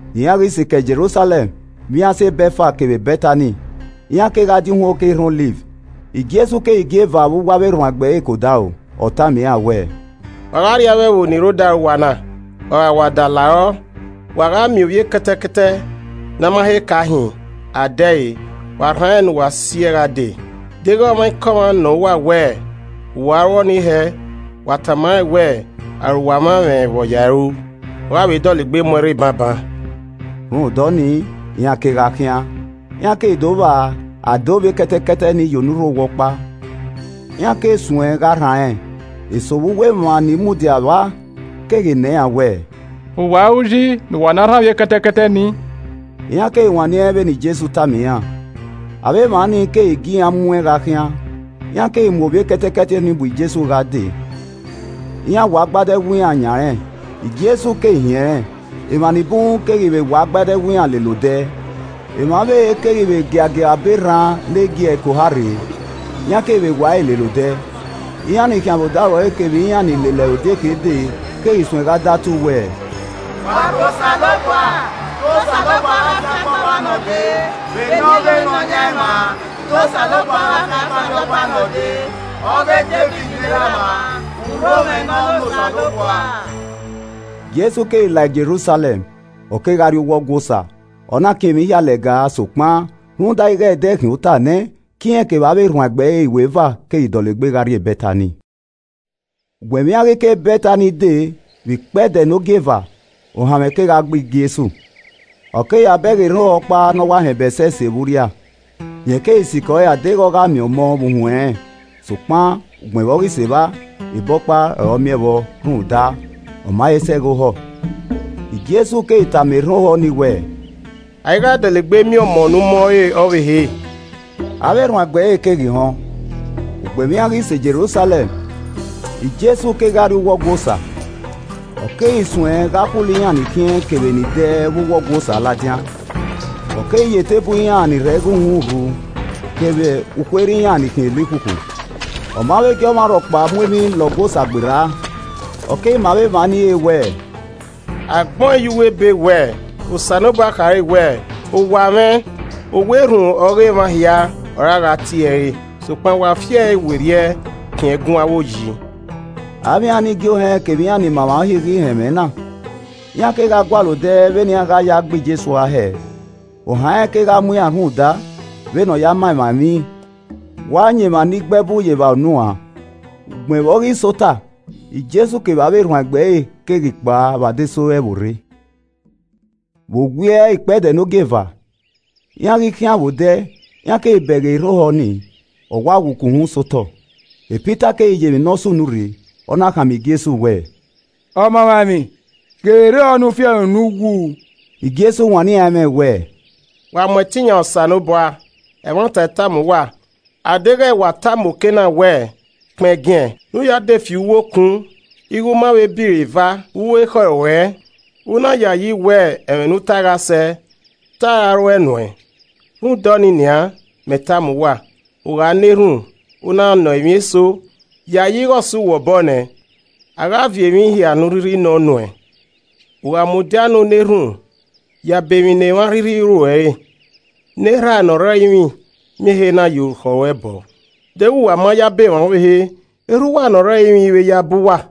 Iran ghi sikẹ Jerusalẹm, vbe iran sẹ Bẹtfag kevbe Bẹtani, iran kegha die uhunmwu oke erhan Ọliv. Jesu keghi gie eva vbe uwu avbe erhuanegbe ẹre ke odaro. Ọ tama iran wẹẹ, “Wa gha rrie avbe ẹvbo ni rre odaro uwa na. Wa gha wa da larọ, wa gha miẹn ovbi ekẹtẹkẹtẹ ne a ma he ka hin, a de ẹre, wa rhan rẹn ne uwa si ẹe gha dee. Deghẹ ọmwaikọmwa nọ uwa wẹẹ, ‘Vbe uwa ru ọnii hẹẹ?’ Wa tama rẹn wẹẹ, ‘Arowa mwa mwẹ vbe ọ ya ẹe ru, ọ gha vbe dọlegbe mu ẹn rre banban.’” Rhunmwuda ọnii, iran kegha khian, iran keghi do vba a dee ovbi ekẹtẹkẹtẹ ni ye onurho owa ọkpa. Iran keghu suẹn gha rhan ẹn. Eso vbe uwu emwa ni mudia vba keghi nọ iran wẹẹ, “Vbe uwa ru yi ne uwa na rhan ovbi ekẹtẹkẹtẹ nii?” Iran keghi wanniẹn vbene Jesu tama iran. Avbe emwa nii keghi gie iran mu ẹn gha khian. Iran keghi mu ovbi ekẹtẹkẹtẹ ni bu Jesu gha dee, iran wa agbada ẹwu iran yan rẹn, Jesu keghi hin ẹnrẹn. Emwa ni bun keghi vbe wa agbada ẹwu iran lele odẹ. Emwa ọvbehe keghi vbe giagia abọ erhan ne giẹrẹ ke oha rre, iran keghi vbe wa ẹre lele odẹ. Iran ni khian vbe odaro ẹre kevbe iran ni lele ẹre odieke dee keghi suẹn gha datu wẹẹ, “Wa rho Osanobua! Te Osanobua gha fiangbe ọmwa ne ọ dee vbe eni ọghe Nọyaẹnmwa! Te Osanobua gha fiangbe arriọba ne ọ dee, ọghe Devid ne erhamwa! Urhomwẹ nọ ne Osanobua.” Jesu keghi lao Jerusalẹm, ọ kegha rrie uwu Ọgua Osa, ọ na kin emwi hia lẹga sokpan, rhunmwuda ighe ẹdẹ khian ota nẹ, ke irẹn kevbe avbe erhuanegbe ẹre iweva keghi dọlegbe gha rrie Bẹtani. Ugbẹn vbe iran ghi ke Bẹtani de vbe ikpẹdẹ ne ogieva, ohanmwẹ kegha gbe Jesu. Ọ keghi ya bẹghe erhan ohọ ọkpa ne ọ wa họn ebe ẹsẹse vbe urria. Rẹn keghi sikẹ ọre a deghẹ ọ gha miẹn ọmọ vbe uhunmwu ẹnrẹn, sokpan ugbẹn vbe ọ sẹ evba, ebe ọkpa ọre ọ miẹn vbọ rhunmwuda, ọ ma he sẹ ẹghẹ ohọ. Jesu keghi tama erhan ohọ ni wẹẹ, “A i gha dọlegbe miẹn ọmọ ne u mọẹn re ọvbehe.” Avbe erhuanegbe ẹre keghi họn. Ugbẹn vbe iran ghi sẹ Jerusalẹm, Jesu kegha rrie uwu Ọgua Osa, ọ keghi suẹn gha khulo iran ni khiẹn kevbe ni dẹ vbe uwu Ọgua Osa, ladian. Ọ keghi ya eteburu iran ni rọ igho uhunmwu rhu kevbe ukhuerhe iran ni khiẹn elikhukhu. Ọ ma vbe gie ọmwa rhọkpa mu emwi la Ọgua Osa gberra. Ọ keghi ma avbe emwa ni re wẹẹ, “A gbẹn ọẹn ye uwu Ebe wẹ Osanobua khare wẹẹ, ‘Owa mwẹ owa erhunmwu ọghe emwa hia ọre a gha tie ẹre re,’ sokpan wa fiẹe werriẹ khian ẹgun avbe oyi!” Avbe iran ne igie ohẹn kevbe iran ni ma emwa Uhi ghi họn ẹmwẹ na, iran kegha gualọ odẹ vbene iran gha ya gbe Jesu ua hẹẹ. Ohan rẹn kegha mu iran rhunmwuda vbene ọ ya ma emwa emwi wa yan emwa ni gbe ẹbu ye evba unu uan. Ugbẹn vbe ọ ghi sẹ ota, Jesu kevbe avbe erhuanegbe ẹre keghi kpao vbe adesẹ ore ẹvbo rre. Vbe owiẹ ikpẹdẹ ne ogieva, iran ghi khian vbe odẹ iran keghi bẹghe erhan ohọ nii, ọ wa wu ke uhunmwu sẹ otọ. Pita keghi ye emwi ne ọ sunu rre, ọ na khama Jesu wẹẹ, “Ọmamwaemwi, ghe vbe erhan ohọ ne u fi ẹre unu wu.” Jesu wanniẹn iran ẹmwẹ wẹẹ, “Wa mu ẹtin yan Osanobua. Ẹmwata I tama uwa, a deghẹ wa tama oke na wẹẹ, ‘Kpẹngiẹn, ne u ya de fi uwu okun,’ ighe u ma vbe ba iro eva vbe uwu ekhọe ruẹ, u na yayi wẹ ẹmwẹ ne u tae gha sẹ, te a gha ruẹe nuẹn. Rhunmwuda ọnii nian, mẹ tama uwa. U gha na erhunmwu, u na nọ emwi eso, yayi ighe ọ sẹ uwẹ obọ nẹ, a gha viọ emwi ne u rhirhi nọ nuẹn. U gha mudia ne u na erhunmwu, yabọ emwi ne emwa a rhirhi ru uẹ re, ne Erha a ne ọ rre ẹrinmwi miẹn ehe na ye orukhọ ruẹ bọọ. [Deghẹ uwa ma yabọ emwa ọvbehe, Erha uwa ne ọ rre ẹrinmwi i vbe yabọ uwa.]”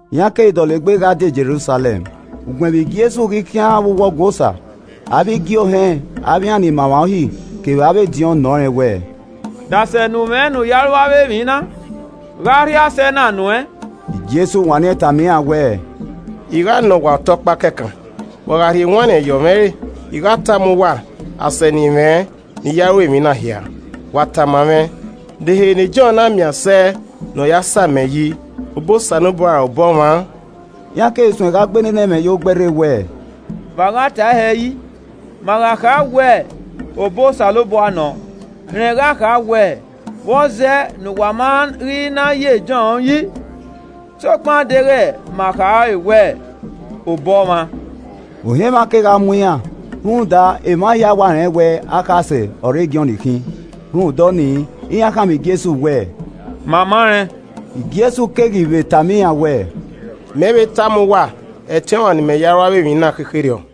Iran keghi dọlegbe gha die Jerusalẹm. Ugbẹn vbe Jesu ghi khian vbe uwu Ọgua Osa, avbe igiohẹn avbe iran ni ma emwa Uhi kevbe avbe ediọn nọ rẹn wẹẹ, “De asẹ ne u mwẹ ne u ya ru avbe emwi na? Gha ọ rhie asẹ na nuẹn?” Jesu wanniẹn tama iran wẹẹ, “I gha nọ uwa ọta ọkpa kẹkan, wa gha rhie ewanniẹn yọmwẹ ẹre, I gha tama uwa asẹ ne I mwẹ ne I ya ru emwi na hia. Wa tama mwẹ, de ehe ne Jọn na miẹn asẹ ne ọ ya samẹ yi, obọ Osanobua ra obọ ọmwa?” Iran keghi suẹn gha gbe nene ẹmwẹ yo gbẹe rre wẹẹ, “Vbe a gha tae hẹ yi? Ma gha kha wẹ, ‘Obọ Osanobua nọ’ rẹn gha kha wẹ ‘Vbọzẹ ne uwa ma ghi na ye Jọn yi?’ Sokpan a deghẹ ma khare wẹẹ, ‘Obọ ọmwa’” (Ohan emwa kegha mu iran, rhunmwuda emwa hia wa rẹn wẹ akhasẹ ọre Jọn khin.) Rhunmwuda ọnii, iran khama Jesu wẹẹ, “Ma ma rẹn.” Jesu keghi vbe tama iran wẹẹ, “Mẹ i vbe tama uwa ẹtin ne I ya ru emwi na khekherriọ.”